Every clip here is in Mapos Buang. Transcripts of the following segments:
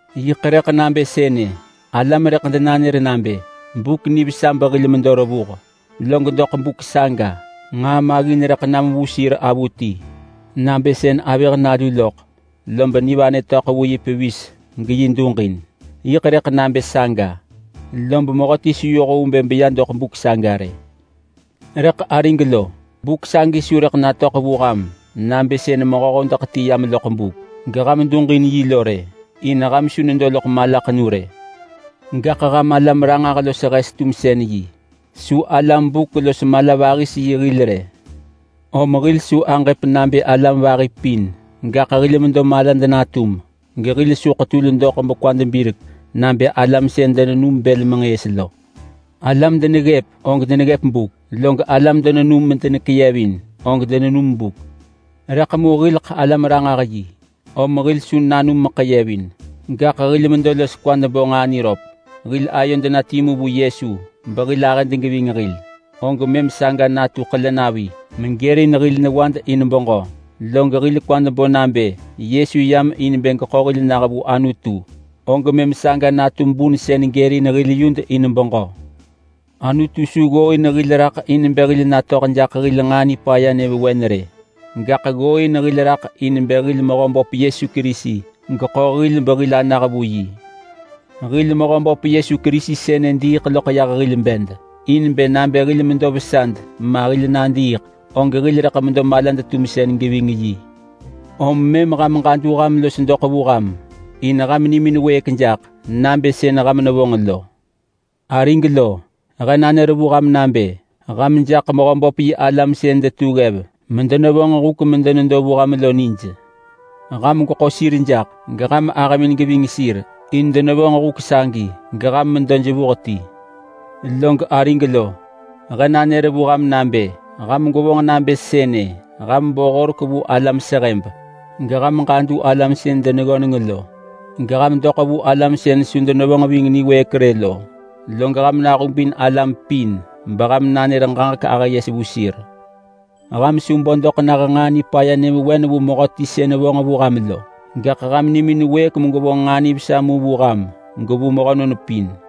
Yiḳ rëḳ nabë sënë: Alam rëḳ denanër nabë, “Buk nivesa behil medo revuh!” log doḳ buk saga nġaa maggin rëḳ nam vu sir avuti, nabë sën avëh nalu loḳ lob nivanë töḳ vu yi pevis geyi duġin. Yiḳ rëḳ nabë saga, lob mehöti su yoh vu bë beya doḳ buk saga rë. Rëḳ arig lo, buk sagi su rëḳ natöḳ vu ham nabë sën mehö hodeḳ ti yam loḳ buk geham duġin yi lo rë, in ham su nedo loḳ malaḳenu rë. Gaḳ ham alam ranġah los hes tumsën yi. Su alam buk los mala-vahis-yi hil rë. Om hil su aġëp nabë alam vahi pin, gaḳ hil medo malad natum gehil su ḳetul doḳ bekwad birek nabë alam sën denenum bël menġëës lo. Alam deneggëp og deneggëp buk, log alam denenum medenekeyevin, og denenum buk. Rëḳ mu hil alam-ranġah-yi om hil su nanum meḳeyevin, gaḳ hil medo los kwad bo nġaa niröp. Hil ayod na timu vu Yesu behil ahëd geving hil, og mëm saga natu ḳelenavi megërin hil newad in beġö. Log hil kwad bo nabë Yesu yam in bë geḳo hil nah vu Anutu, og mëm saga natu bun sën gërin hil yud in beġö. Anutu su ggooin hil raḳ in bë hil natöḳ jaḳ hil nġaa nipaya nyëvewen rë, gaḳ ggooin hil raḳ in bë hil Mehöböp Yesu Kerisi geḳo hil behil anah vu yi. Hil Mehöböp Yesu Kerisi sënë diiḳ loḳ yah hil bed in bë nabë hil medo vesad ma hil nadiiḳ, og hil rëḳ medo malad-tumsën geving yi. Om mëm ham ġadu ham los doḳ vu ham in ham nimin wëëk jaḳ, nabë sën ham nevonġ lo. Arig lo, he nanër vu ham nabë ham jaḳ Mehöböp yi alam sën detu ggev medenevonġ huk medenedo vu ham lo nij. Ham gweḳo sir jaḳ, geham ahëmin geving sir in denevonġ huk sagi, geham medo jevuh ti. Log arig lo, he nanër vu ham nabë ham gwevonġ nabë sënë: Ham bo horek vu alam sehëb, geham ġadu alam sën deneggöneng lo. Geham doḳ vu alam sën su denevonġ ving niwëëk rë lo, log ham nahubin alam pin beham nanër ġaġek ahë yes vu sir. Ham su bo doḳ nah nġaa nipaya nyëvewen vu mehöti sën vonġ vu ham lo, gaḳ ham nimin wëëk megwevonġ nġaa nivesa mu vu ham gevu mehönon pin.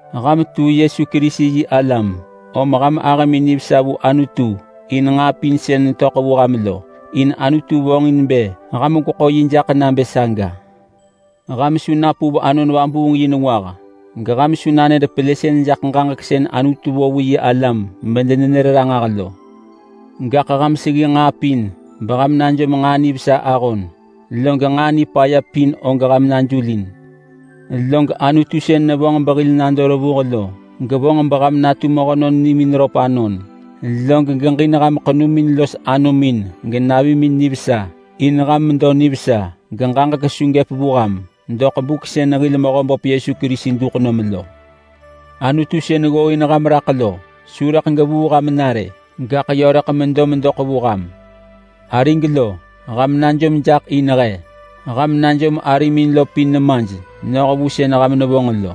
Ham tu Yesu Kerisi yi alam, om ham ahëmin nivesa vu Anutu in nġaa pin sën netöḳ vu ham lo, in Anutu vonġin bë ham gweḳo yi jaḳ nabë saga. Ham su napuv Anon Vabuung yi nengwah, geham su nanër pelësën jaḳ ġaġek sën Anutu vo vu yi alam medenenër ranġah lo. Gaḳ ham seggi nġaa pin beham najom nġaa nivesa ahon, log nġaa nipaya pin og ham najulin. Log Anutu sën nevonġ behil nado revuh lo gevonġ beham natu mehönon nimin röp anon. Log geġin ham ḳenumin los anomin genavimin nivesa, in ham medo nivesa geġaġek su gëp vu ham doḳ buk sën hil Mehöböp Yesu Kerisi duḳ nom lo. Anutu sën ggooin ham raḳ lo su rëḳ gevuu ham na rë, gaḳ yö rëḳ medo medoḳ vu ham. Arig lo, ham najom jaḳ in he. Ham najom arimin lo pin nemaj noh vu sën ham nevonġ lo.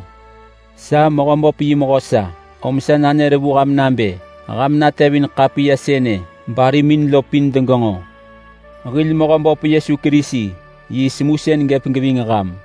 Sa Mehöböp yi mehö sa, om sa nanër vu ham nabë ham natevin ḳapiya sënë barimin lo pin degenġo. Hil Mehöböp Yesu Kerisi yi semusën gëp geving ham.